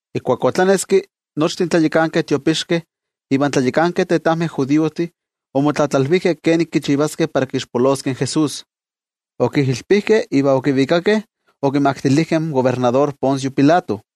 Ijkuak otlaneski, nochtin tlayakankeh tiopixkeh ivan tlayakankeh tetajmeh judiojtih, omotlatlalvijkeh kenik kichivaskeh para kixpoloskeh in Jesús. Okijilpijkeh iva okivikakeh okimaktilijkeh in kobernador Poncio Pilato.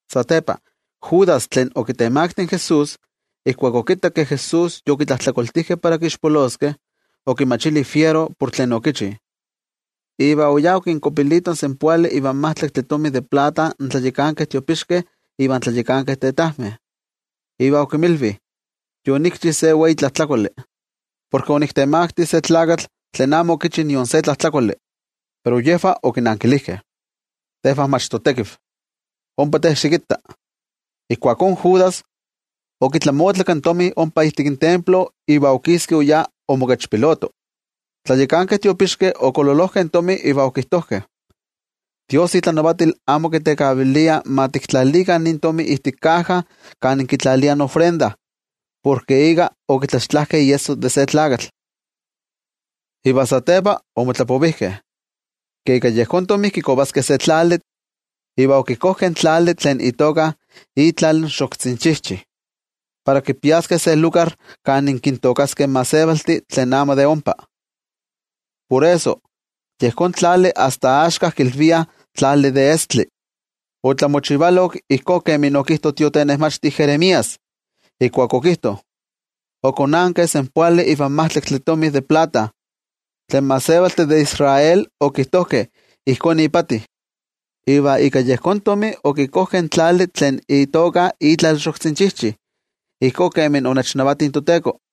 Satepa Judas, tlen okitemakti in Jesús, ijkuak okittak ke Jesús yokitlajtlakoltijkeh para kixpoloskeh, okimachili fiero por tlen okichi, iva oyá okinkuapilito in senpoali ivan majtlaktli tomi de plata in tlayakankeh tiopixkeh ivan tlayakankeh tetajmeh. Iva okinmilvi: —Yonikchi se wei tlajtlakoli, porke oniktemakti se tlakatl tlen amo okichi nion se tlajtlakoli. Pero yejvah okinankilijkeh: —¡Tejvah mach totekiv! ¡Ompa te xikitta! Ijkuakó Judas okitlamotlak in tomi ompa ijtik templo, iva okiski oyá omokechpiloto. In tlayakankeh tiopixkeh okololojkeh in tomi iva okijtojkeh: —Dios itlanavatil amo kitekavilia ma tiktlalikah nin tomi ijtik kaja kan kitlaliah ofrendajtomi, porke ika okitlaxtlajkeh iesso de se tlakatl. Iva satepa omotlapovijkeh ke ika yejón tomi kikovaskeh se tlali, iva okikojkeh in tlali tlen itoka Itlal in Xoktzinchijchi, para kipiaskeh se lugar kan kintookaskeh in gentejtih tlen amo de ompa. Por eso, yejón tlali asta axka kilviah Tlali de Estli. Otlamochivalok ijkó kemi okijto in tiotenejmachti Jeremías, ijkuak okijto: “Okonankeh senpoali ivan majtlaktli tomi de plata, tlen gentejtih de Israel okijtojkeh ijkó ipati. Iva ika yejón tomi okikojkeh in tlali tlen itoka Itlal in Xoktzinchijchi, ijkó kemi onechnavati in toTeko.”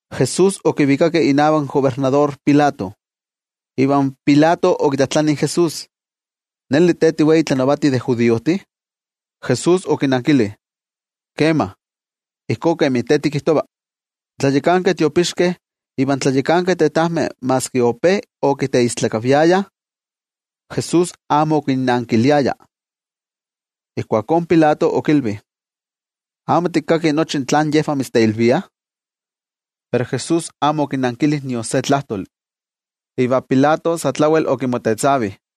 Jesús okivikakeh inavak in kobernador Pilato, iva Pilato okitlajtlani in Jesús: —¿Neli te tiwei tlanavati de judiojtih? Jesús okinankili: —Kema, ijkó kemi te tikijtova. In tlayakankeh tiopixkeh ivan tlayakankeh tetajmeh maski ope okiteistlakaviayah, Jesús amo okinnankiliaya. Ijkuakó in Pilato okilvi: —¿Amo tikkaki nochi tlen yejvah mitzteilviah? Pero Jesús amo okinankili nion se tlajtoli, iva Pilato sa tlawel okimotetzavi.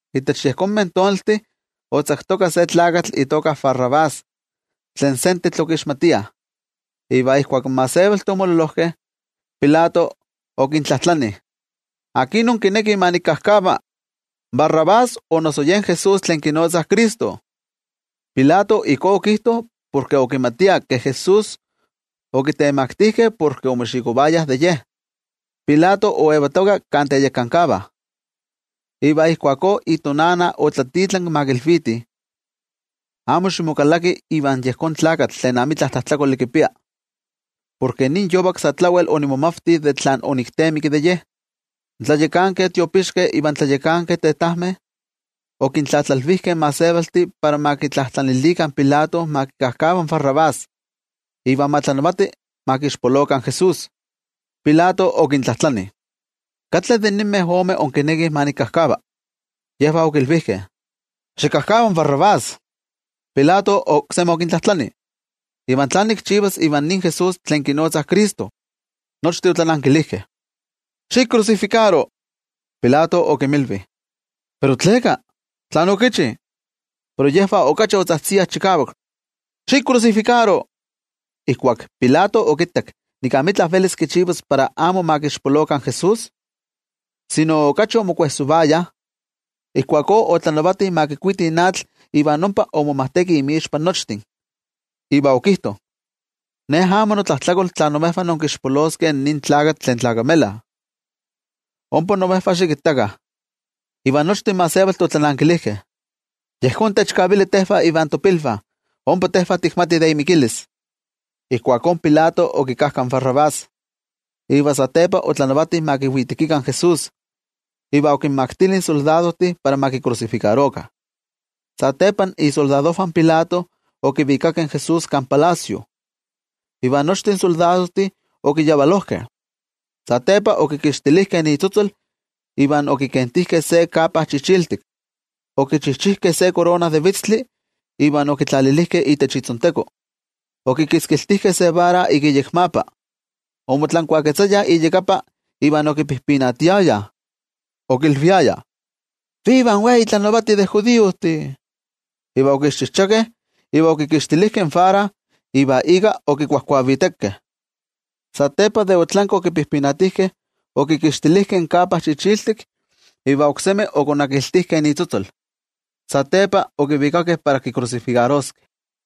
Itech yejonmeh tonaltih otzaktoka se tlakatl itoka Barrabás tlen sentetl okixmatiah. Iva ijkuak in gentejtih omololojkeh, Pilato okintlajtlani: —¿Akin inkinekih ma nikkajkava: in barrabás o noso yen Jesús tlen kinotzah Cristo? Pilato ijkó okijto porke okimatia ke Jesús okitemaktijkeh porke omoxikovayah de Ye. Pilato oyetoka kan teyekankavah. Iva ijkuakó itonana otlatitlanki ma kilvitih: “Amo ximokalaki ivan yejón tlakatl tlen amitla tlajtlakoli kipia, porke nin yovak sa tlawel onimomavti tlen oniktemikki de Ye.” In tlayakankeh tiopixkeh ivan tlayakankeh tetajmeh, okintlatlalvijkeh in gentejtih para ma kitlajtlanilikah in Pilato ma kikajkava in Barrabás, iva ma tlanavati ma kixpolokah in Jesús. Pilato okintlajtlani: —¿Katli de ninmeh omeh inkinekih ma nikajkava? Yejvah okilvijkeh: —¡Xikajkava in Barrabás! Pilato oksemi okintlajtlani: —¿Iva tlán nikchivas ivan nin Jesús, tlen kinotzah Cristo? Nochtin otlanankilijkeh: —¡Xikrusifikaro! Pilato okinmilvi: —¿Pero tleka? ¿Tlán okichi? Pero yejvah okachi otzajtziah chikavak: —¡Xikrusifikaro! Ijkuak Pilato okittak nik amitla velis kichivas para amo ma kixpolokah in Jesús, sino yej okachi omopajsolovayah, ijkuakó otlanavati ma kikuitih atl iva ompa omomajteki inmixpa nochtin, iva okijto: —Ne amo notlajtlakol tla imejvah inkixpoloskeh nin tlakatl tlen tlakamela. Ompa imejvah xikittakah. Iva nochtin gentejtih otlanankilijkeh: —¡Yejón techkavili tejvah ivan topilvah, ompa tejvah tikmatih de imikilis! Ijkuakó Pilato okikajka in Barrabás. Iva satepa otlanavati ma kiwitekikah in Jesús, iva okinmaktili in soldadojtih para ma kikrusifikarokah. Satepa isoldadojvah in Pilato okivikakeh in Jesús kan palacio, iva nochtin soldadojtih okiyavalojkeh. Satepa okikixtilijkeh itzotzol, iva okikentijkeh se kapa chichiltik. Okichijchijkeh se korona de vitztli iva okitlalilijkeh itech itzonteko. Okitzkiltijkeh se vara iyekmapa. Omotlankuaketzayah iyakapa iva okipijpinatiayah, okilviayah: —¡Viva in wei tlanavati de judiojtih! Iva okixchichijchakeh, iva okikixtilijkeh in vara iva ika okikuavijvitekeh. Satepa de otlanki okipijpinatijkeh, okikixtilijkeh in kapa chichiltik iva oksemi okonakiltijkeh itzotzol. Satepa okivikakeh para kikrusifikaroskeh.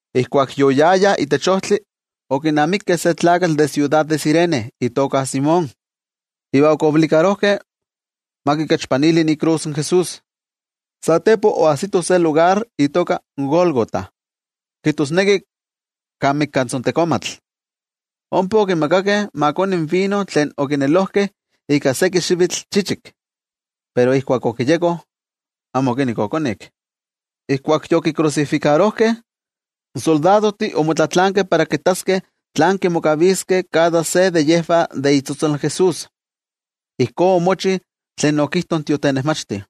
Ijkuak yoyayah itech ojtli okinamikeh se tlakatl de siudad de Cirene itoka Simón. Iva okichikavilijkeh ma kikechpanili ikrus in Jesús. Satepa oajsitoh se lugar itoka Gólgota, kijtosneki Kan Mikatzontekomatl. Ompa okimakakeh ma koni vino tlen okinelojkeh ika seki xivitl chichik. Pero ijkuak okiyeko, amo okinekki okonik. Ijkuak yokikrusifikarojkeh, in soldadojtih omotlatlaankeh para kittaskeh tlán kimokaviskeh kada se de yejvah de itzotzol Jesús. Ijkó omochi tlen okijto in tiotenejmachti: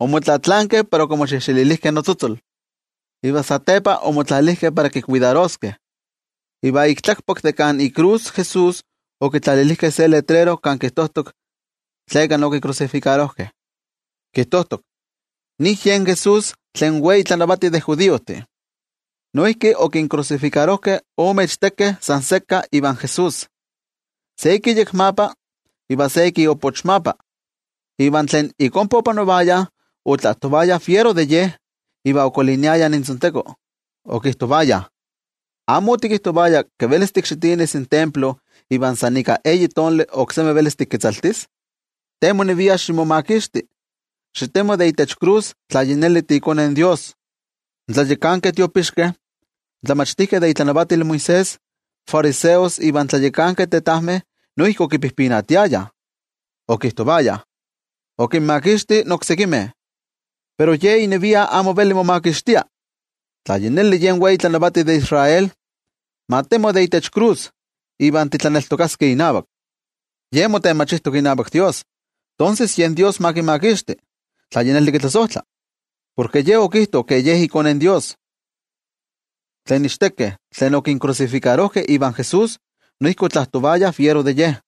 “Omotlatlaankeh para okimoxejxelilijkeh notzotzol.” Iva satepa omotlalijkeh para kikuidaroskeh. Iva ik tlakpak de kan ikrus in Jesús okitlalilijkeh se letrero kan kijtojtok tleka okikrusifikarojkeh. Kijtojtok: “NIN YEN JESÚS, TLEN WEI TLANAVATI DE JUDIOJTIH.” Noijki okinkrusifikarojkeh ome ichtekeh san sekka ivan Jesús, se ik iyekmapa iva se ik iopochmapa. Iva tlen ik ompa opanovayah otlajtovayah fiero de Ye, iva okoliniayah intzonteko okijtovayah: —¿Amo otikijtovaya ke velis tikxitinis in templo iva san ika eyi tonali oksemi velis tiketzaltis? Te monevia ximomakixti. Xitemo de itech krus tla yi neli tiiKone in Dios. In tlayakankeh tiopixkeh, in tlamachtijkeh de itlanavatil Moisés, in fariseos ivan tlayakankeh tetajmeh noijki okipijpinatiayah. Okijtovayah: —Okinmakixti oksekimeh, pero Ye inevia amo veli momakixtia. Tla yi neli yen wei tlanavati de Israel, ma temo de itech krus, iva titlaneltokaskeh inavak. Ye motenmachijtok inavak Dios, tonses yen Dios ma kimakixti, tla yi neli kitlasojtla. Porke Ye okijto ke Ye iKone in Dios. Tlen ichtekeh tlen okinkrusifikarojkeh ivan Jesús noijki otlajtovayah fiero de Ye.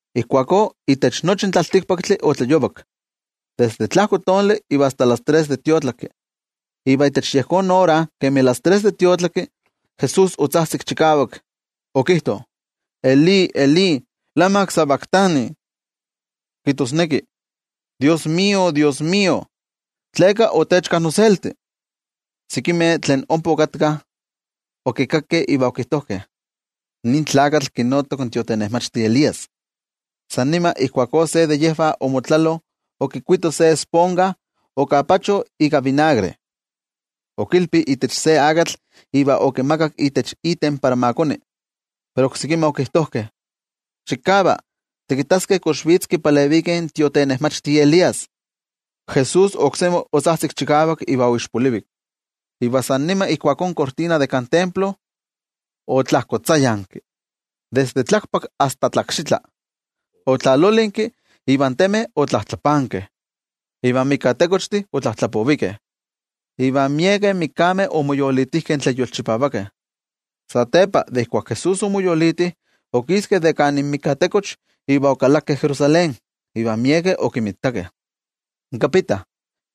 Ijkuakó itech nochi in tlaltikpaktli otlayovak, desde tlajko tonali iva asta las tres de tiotlaki. Iva itech yejón ora kemi las tres de tiotlaki, Jesús otzajtzik chikavak, okijto: —Elí, Elí, ¿lama sabactani? —kijtosneki: NoTajtzin Dios, noTajtzin Dios, ¿tleka otechka noselti? Sekimeh tlen ompa okatkah, okikakkeh iva okijtojkeh: —Nin tlakatl kinotok in tiotenejmachti Elías. San nima ijkuakó se de yejvah omotlelo okikuito se esponja, okapacho ika vinagre, okilpi itech se akatl iva okimakak itech iten para ma koni. Pero oksekimeh okijtojkeh: —Xikava, tikittaskeh kox vitz kipaleviki in tiotenejmachti Elías. Jesús oksemi otzajtzik chikavak, iva oixpolivik. Iva san nima ijkuakó in tzotzoltlatzakuili de kan templo otlajkotzayanki, desde tlakpak asta tlakxitla. Otlalolinki iva in temeh otlajtlapankeh. Iva in mikatekochtih otlajtlapovikeh, iva miekeh mikameh omoyolitijkeh tlen yolchipavakeh. Satepa de ijkuak Jesús omoyoliti, tlen omoyolitijkeh okiskeh de kan inmikatekoch iva okalakeh Jerusalén, iva miekeh okinmitakeh. In kapita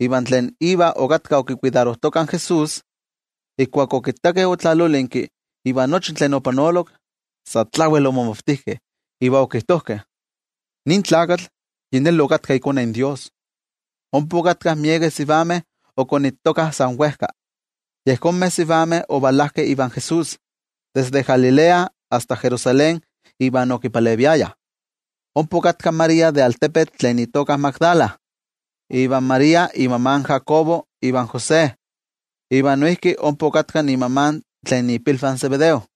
iva tlen iva okatkah okikuidarojtokah in Jesús, ijkuak okittakeh otlalolinki iva nochi tlen opanolok, sa tlawel omomavtijkeh iva okijtojkeh: —Nin tlakatl yi neli okatka iKone in Dios. Ompa okatkah miekeh sivameh okonittokah san wejka. Yejonmeh sivameh ovalajkeh ivan Jesús desde Galilea asta Jerusalén iva okipaleviayah. Ompa okatka in María tlen de altepetl Magdala, iva María inmama in Jacobo ivan José. Iva noijki ompa okatka inmama tlen ipilvah in Zebedeo.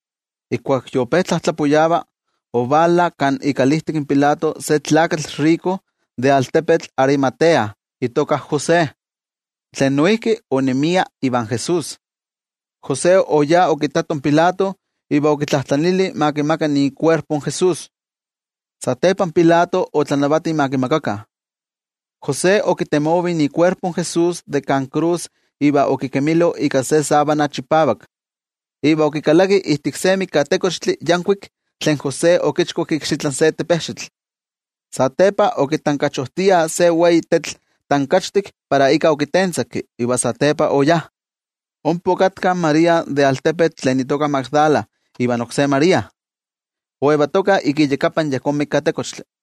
Ijkuak yope tlajtlapuyava, ovala kan ikalijtik Pilato se tlakatl tomine de altepetl Arimatea itoka José, tlen noijki onemia ivan Jesús. José oyá okittato in Pilato iva okitlajtlanili ma kimaka ikuerpo in Jesús. Satepa Pilato otlanavati ma kimakakah. José okitemovi ikuerpo in Jesús de kan krus iva okikemilo ika se sábana chipavak. Iva okikalaki ijtik se mikatekochtli yankuik tlen José okichkuak ikxitlan se tepejxitl. Satepa okitankachojtia se wei tetl tankachtik para ika okitentzaki, iva satepa oyá. Ompa okatka in María tlen de altepetl Magdala ivan oksé María, oyetokah iyakapan yejón mikatekochtli.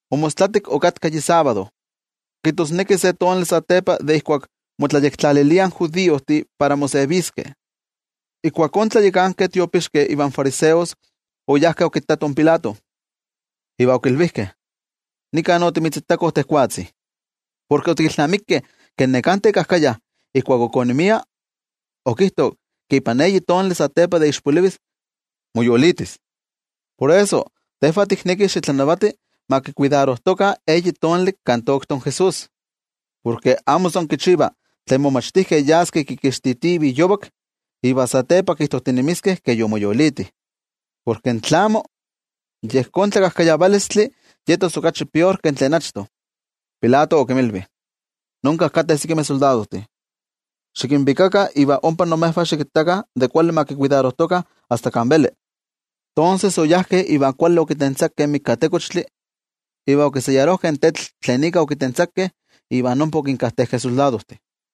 Omostlatik okatka yi sábado, kijtosneki se tonali satepa de ijkuak motlayektlaliliah in judiojtih para moseviskeh. Ijkuakó in tlayakankeh tiopixkeh ivan fariseos oyajkeh okittatoh in Pilato, iva okilvijkeh: —Nika otimitzitakoh tejwatzi, porke otikilnamikeh ke neká tekajkaya, ijkuak ok onemia, okijto ke ipan eyi tonali satepa de ixpolivis, moyolitis. Por eso, tejvah tiknekih xitlanavati ma tlakuidarojtokah eyi tonali kan toktok in Jesús. Porke amo san kichiva tlen momachtijkeh yaskeh kikixtitivih yovak, iva satepa kijtojtinemiskeh ke yomoyoliti. Porke tlamo, yejón tlakajkayavalistli yetos okachi pior ke tlen achto. Pilato okinmilvi: —Nonka kateh sekimeh soldadojtih. Xikinvikakah iva ompa imejvah xikittakah kuali ma tlakuidarojtokah asta kan veli. Tonses, oyajkeh iva kuali okitentzakeh in mikatekochtli, iva okiseyarojkeh in tetl tlen ika okitentzakeh, iva ompa okinkajtejkeh in soldadojtih.